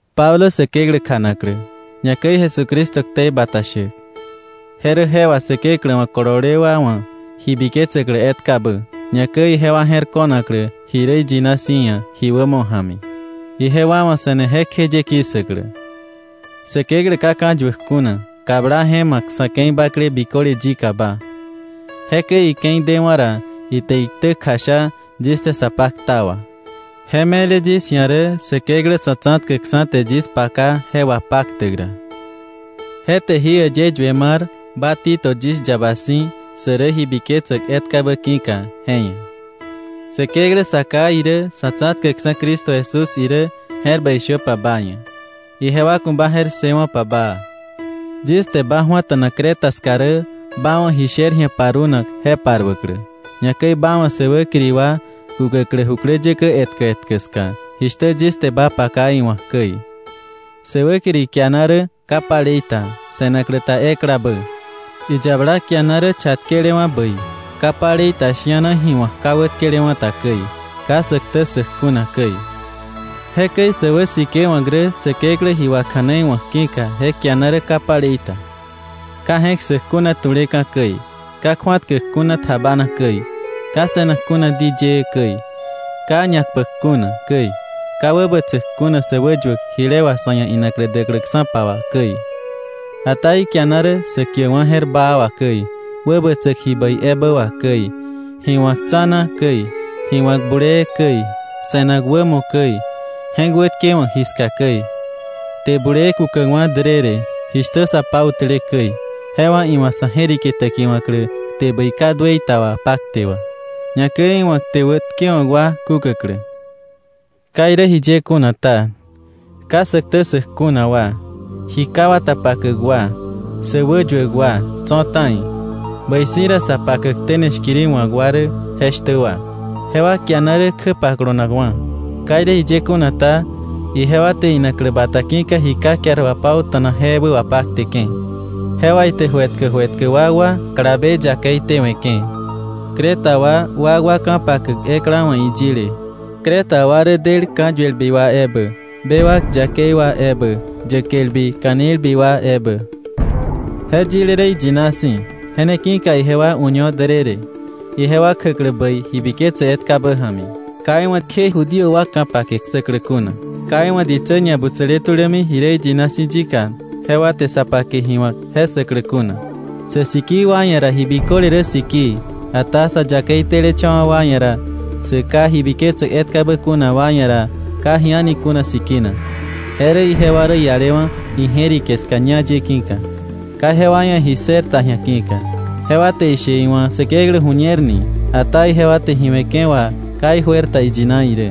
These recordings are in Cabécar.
Pablo Säkeklä kjanaklä, ñakäi Jesucristo ktei bata shäk, je rä je wà Säkeklä wa̱ kolole wa wa̱ ji biketsäklä etkabä, ñakäi ijewa je̱r ko̱naklä ji rä iyina si̱ ia̱ ji wämo ja̱mi, ijewa wa̱ se̱ne jekjeye ki̱ssäklä. Säkeklä ka ka̱yuäk kuna, kabla je ma̱k sa̱ ke̱i bakle biköle yikaba. Jekäi ike̱i dewa̱ ra, ite iktä kjasha yis te sa pakta wà. Je me̱le yis ia̱ rä Säkeklä Sa̱tsa̱tkäkksa̱ te yis paka je wapaktäk ra. Je te jí äyë yue mar ba Tito yis yaba si̱, sä rä ji biketsäk etkabä ki̱ka je ia̱. Säkeklä Sa Ká irä, Sa̱tsa̱tkäkksa̱ Cristo Jesús irä, je̱r bäi shöpa ba ia̱, ijewa ku̱ ba je̱r ssëwo̱pa baa. Yis te ba ju̱ata̱na Creta ska rä ba wa̱ ji sher ji̱a parunak je paruäklä, ñakäi ba wa̱ sä wäkiri wa kukäklä jukläyäkä etkä etkä ska, jishtä yis te ba paka iwa̱k käi. Sä wäkiri kiana rä ka palei ta, se̱naklä ta eklabä. Iyabala kiana rä chatkelewa̱ bäi, ka palei ta shi̱ana ji wa̱k ka wätkelewa̱ ta käi, ka sä ktä ssäk kuna käi. Jekäi sä wäsikewa̱k rä Säkeklä ji wakja̱neiwa̱k ki̱ka je kiana rä ka palei ta, ka je̱k ssäk kuna tu̱leka̱ käi, ka kju̱atkäk kuna tjabana käi, ka se̱nak kuna di yëë käi, ka ñakpäk kuna käi, ka wäbätsäk kuna sä wäyuäk jile wà sa̱ ia̱ inaklä däkläksa̱pa wà käi. Ata ikiana rä sä kiäkwa̱ je̱r baa wà käi, wäbätsäk ji bäi ebä wà käi, ji wa̱k tsa̱na käi, ji wa̱k bulee käi, se̱nak wämo käi, je̱k wätkewa̱k ji ska käi, kte bulee kukäkwa̱ därërë, jishtä sa pautäle käi, je wà iwa̱ sa̱ je̱rike täkiwa̱klä kte bäi ka duëi ta wapakte wà, ñakäi iwa̱ kte wätkewa̱k wa kukäklä. Ka irä jiye kuna ta, ka sä ktä ssäk kuna wa, ji ka wata pakäk wa, sä wäyuäk wa tso̱ ta̱i, bäi si̱ ra sa pakäk tene shkiri wa̱k wa rä jeshtä wa. Jewa kiana rä kjä pakolonakwa̱. Ka irä jiye kuna ta, ijewa te inaklä bata ki̱ka ji ka kiar wapauta̱nak je ebä wapakteke̱. Je wà ite ju etkä ju etkä wakwa kalabe yakei tewe̱ke̱. Creta wa wakwa ka̱pakäk ekla wa̱ iyile: “Creta wa rä del ka̱yuelbi wa ebä, bewak yakei wa ebä, yäkelbi ka̱nilbi wa ebä.” Je yile rä iyina si̱. Je ne ki̱ka ijewa uño därërë, ijewa kjäklä bäi ji biketse etkabä ja̱mi, ka iwa̱ kje Judío wa ka̱pake ssäklä kuna, ka iwa̱ ditsä ñabutsäle tulämi ji rä iyina si̱ yika jewa te sa pake ji wa̱k je ssäklä kuna. Sä sikii wa ia̱ ra ji biköle rä sikii, ata sa yakei telecha̱wa̱ wa ia̱ ra, sä ka ji biketsäk etkabä kuna wa ia̱ ra, ka ji a̱ni kuna sikina, je rä ijewa rä ialewa̱ ije̱rike ska ñá ye ki̱ka, ka jewa ia̱ ji ssër ta ji̱a ki̱ka. Jewa te ishe iwa̱ Säkeklä ju̱ñer ni, ata ijewa te ji we̱ke̱ wà ka ijuer ta iyina irä.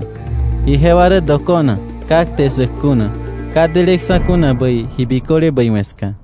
Ijewa rä dokona, ka kte ssäk kuna, ka deleksa̱ kuna bäi ji biköle bäi we̱ ska.